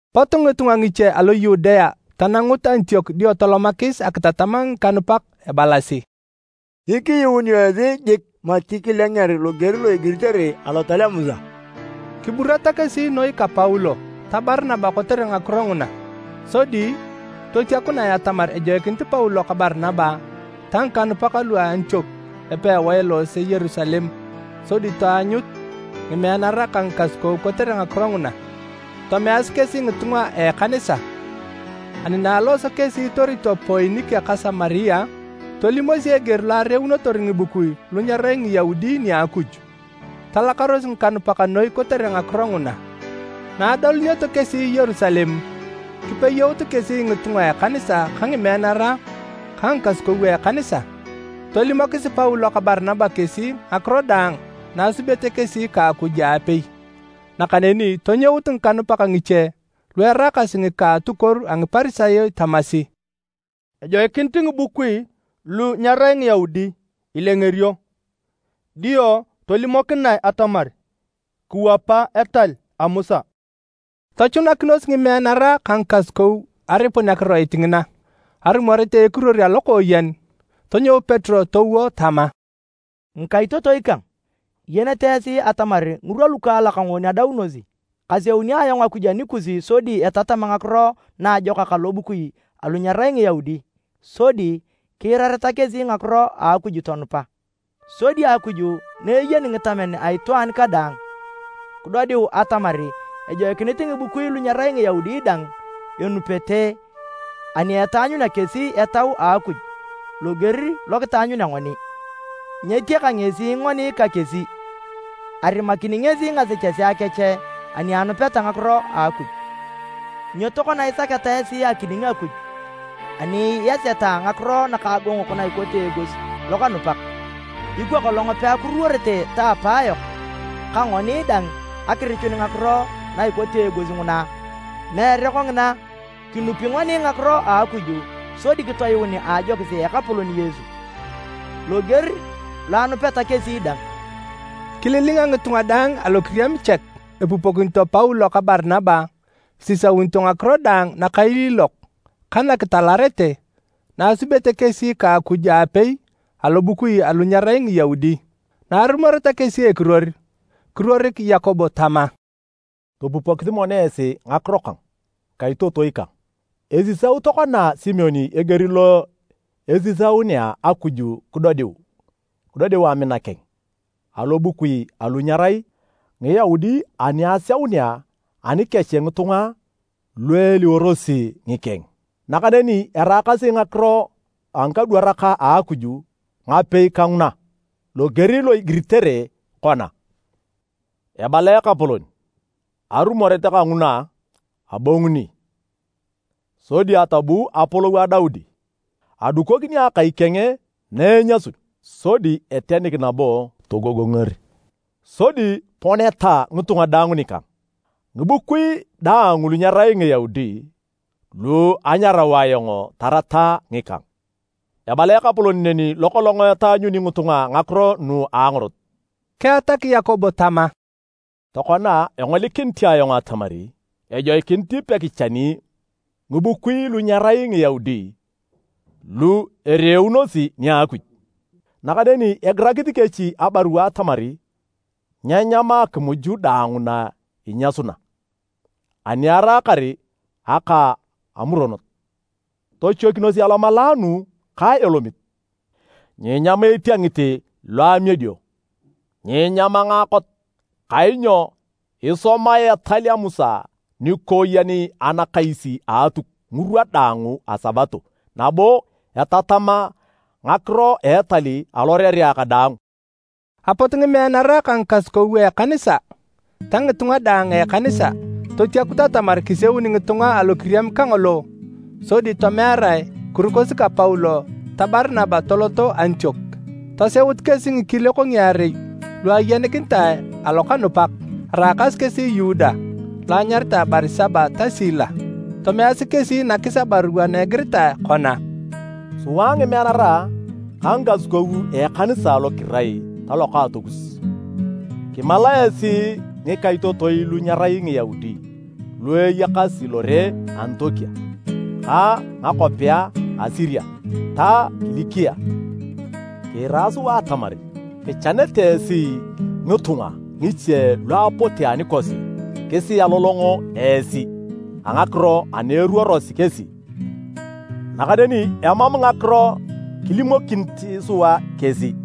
Pot ngitunga ngiche alo Yudea tanangut Antiok dio tolomakis akitatam ngikanupak ebalasi, “Nyikiyuunio esi jik mati kilenger loger lo igiritere Lotal a Musa.” Kiburata kesi noi ka Paulo ta Barinaba kotere ngakiro nguna. Sodi totiakunae atamar ejoikinit Paulo ka Barinaba ta ngikanupak lu a Antiok epewae eloose Yerusalem sodi taanyut ngimeanara ka ngikasukou kotere ngakiro nguna. Tomeasi kesi ngitunga a ekanisa. Ani na alooso kesi itorito Poinike ka Samaria, tolimosi eger lo areunotor ngibukui lu nyerai Ngiyaudi nia Akuj. Talakaros ngikanupak noi kotere ngakiro nguna. Na adolunioto kesi Yerusalem, kipeyout kesi ngitunga a ekanisa ka ngimeanara ka ngikasukou a ekanisa. Tolimokis Paulo ka Barinaba kesi ngakiro daang na asubete kesi ka Akuj aapei. Nakaneni tonyout ngikanupak ngiche lu eraakasi ngika a atukuoru a Ngiparisayo tamasi, “Ejoikinit ngibukui lu nyerai Ngiyaudi ilengerio, dio tolimokinae atamar kiwapa etal a Musa.” Tochunakinos ngimeanara ka ngikasukou aripun akiroit ngina. Arumoret a ekiruor alokooyen, tonyou Petero towo tama, “Ngikaitotoi kang, iyenete esi atamar ngirwa lukaalak ngoon adaunosi, kaseuni ayong Akuj anikus sodi etatam Ngakiro Naajokak alobukui alu nyerai Ngiyaudi sodi kiirareta kesi ngakiro a Akuj tonupa. Sodi Akuj na eyeni ngitamen a itwaan kadaang, kidodiu atamar ejoikinit ngibukui lu nyerai Ngiyaudi dang enupete ani etaanyunea kesi Etau a Akuj loger lo kitaanyunea ngoni. Nyetiaka ngesi ngoni ka kesi, arimakini ngesi ngasechesea kech ani anupeta Ngakiro a Akuj. Nyo tokona isaketa esi akining Akuj ani iaseta ngakiro nakagogongok ikote eegos lokanupak? Ikwa kolong peakuruworete ta apayok ka ngoni dang akirichun ngakiro na ikote eegos nguna? Meere kongina! Kinupi ngoni ngakiro a Akuj sodi kitoyuun a ajokis a Ekapolon Yesu, loger lo enupeta kesi dang.” Kililinga ngitunga daang alokiriam chek epupokinito Paulo ka Barinaba isisaunito ngakiro daang nakailiilok ka nakitalarete na asubete kesi ka Akuj aapei alobukui alu nyerai Ngiyaudi. Na arumoreta kesi ekiruor, kiruorik Yakobo tama, “Topupokisi mono esi ngakiro kang ngikaitotoi kang! Esisau tokona Simon eger lo esiaunea Akuj kidodiu amina keng alobukui alu nyerai Ngiyaudi ani aseunea anikech ngitunga lu eliworosi ngikeng. Nakaneni eraakasi ngakiro a ngikadwarak a Akuj ngapei ka nguna, loger lo igiritere kona, ‘Ebala Ekapolon, arumoret kanguna, abonguni, sodi atobuu apolou a Daudi. Adukokini akai keng na enyasun, sodi etenik nabo togogonger. Sodi poneta ngitunga daang nikang, ngibukui daang lu nyerai Ngiyaudi lu anyarau ayong tarata ngikang. Ebala Ekapolon neni lo kolong etaanyuni ngitunga ngakiro nu a angorot.’” Keatak Yakobo tama, “Tokona, engolikinit ayong atamar ejoikinit pekichani ngibukui lu nyerai Ngiyaudi lu ereeunosi nia Akuj. Nakaneni egirakisi kesi abarua atamar nyeenyam akimuj daang na inyasuna ani eraakar aka amuronot. Tochoikinos alomalaanu ka elomit. Nyeenyam etiengit lo amiedio. Nyeenyam ngaakot. Kainyo esomae etal a Musa nikooyen anakais a Atuk ngirwa daang a Sabato nabo etatam ngakiro a etal alorerea kadaang.” Apot ngimeanara ka ngikasukou a ekanisa ta ngitunga daang a ekanisa, totiakut atamar kiseuni ngitunga alokiriam kangolo sodi tomearae kirukosi ka Paulo ta Barinaba toloto Antiok. Toseut kesi ngikiliok ngiarei lu ayenikinitae alokanupak, araakasi kesi Yuda lo anyaritae Barisaba ta Sila. Tomeasi kesi nakis abarua na egiritae kona, “Sua ngimeanara ka ngikasukou a ekanisa lu kirai talokaatokus, kimalae esi ngikaitotoi lu nyirai Ngiyaudi lu iyakasi lore a Antiok ka ngakwapea a Siria ta Kilikia. Kiira sua atamar kichanete esi ngitunga ngiche lu apote anikosi kisialolong esi a ngakiro ana eruorosi kesi. Nakaneni emam ngakiro kilimokinit sua kesi.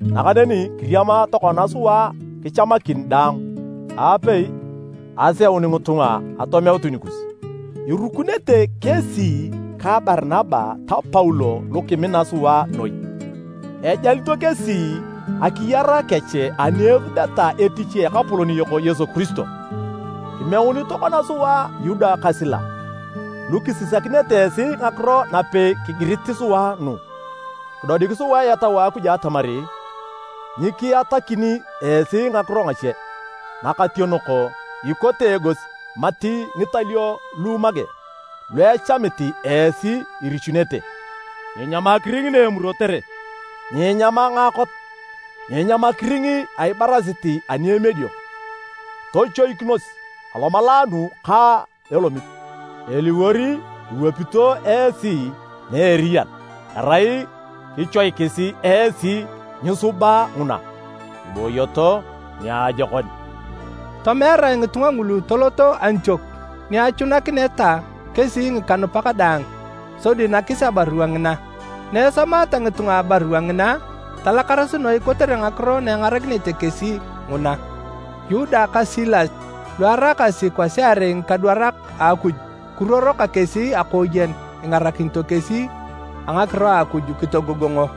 Nakaneni kiriama tokona sua kichamakin daang aapei aseun ngitunga atomeutu nikus. Irukunete kesi ka Barinaba ta Paulo lu kimina sua noi. Ejalito kesi akiyar kech ani esubeta etich a Ekapolon yok Yesu Kiristo. Kimeunit tokona sua Yuda ka Sila lu kisisakinete esi ngakiro napei kigirit sua nu. Kidodik sua Etau a Akuj atamar nyikiatakini esi ngakiro ngache nakationok ikote eegos mati ngitalio lu make, lu echamit esi irichunete. Nyiinyam akiring na emurotere. Nyiinyam ngaakot. Nyiinyam akiring a ibarasit ani emiedio. Tochoikinos alomalaanu ka elomit. Eliwor iwapito esi na eriyan erai kichoikis esi nyiisuba nguna. Kibooyoto niajokon.” Tomearae ngitunga ngulu toloto Antiok ni achunakineta kesi ngikanupak daang sodi nakis abarua ngina. Na esomaata ngitunga abarua ngina, talakaros noi kotere ngakiro na engarakinete kesi nguna. Yuda ka Sila lu araakasi kwasiarei ngikadwarak a Akuj kiruoro ka kesi akooyen ingarakinito kesi a ngakiro a Akuj kitogogongo.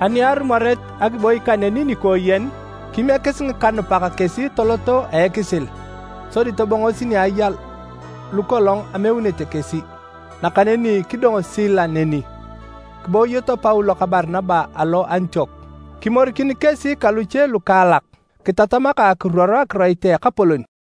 Ani arumoret akiboi kaneni nikooyen, kimiekis ngikanupak kesi toloto a ekisil sodi tobongosi ni aya lukolong ameunete kesi. [ Nakaneni kidong Sila neni.] Kibooyoto Paulo ka Barinaba alo Antiok. Kimorikin kesi ka luche lukaalak kitatama ka akiruoro akiroit a Ekapolon.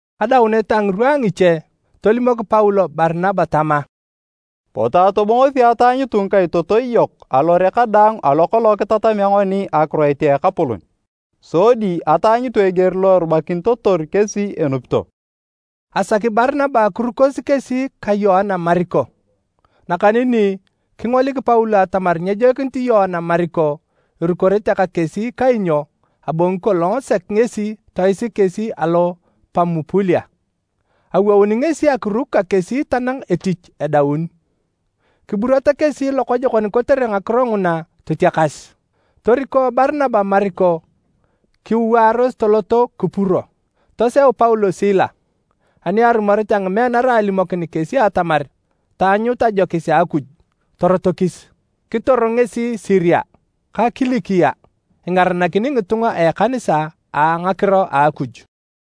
Adaunet a ngirwa a ngiche, tolimok Paulo Barinaba tama, “Potu atobongosi ataanyutu ngikaitotoi yok alore kadaang alo kolong kitatamea ngoni akiroit a Ekapolon sodi ataanyutu eger lo erubakinitotor kesi enupito.” Asaki Barinaba kirukosi kesi ka Yoana Mariko, nakaneni kingolik Paulo atamar nyejoikinit Yoana Mariko irukorete ka kesi kainyo abongi kolong sek ngesi toisik kesi alo Pamupulia. Awouni ngesi akiruk ka kesi tanang etich edaun. Kiburata kesi lokojokon kotere ngakiro nguna totiakas. Toriko Barinaba Mariko kiwaaros toloto Kupuro. Toseu Paulo Sila, ani arumoret a ngimeanara alimokin kesi atamar taanyut ajokis a Akuj, torotokis. Kitor ngesi Siria ka Kilikia, ingaranakini ngitunga a ekanisa a ngakiro a Akuj.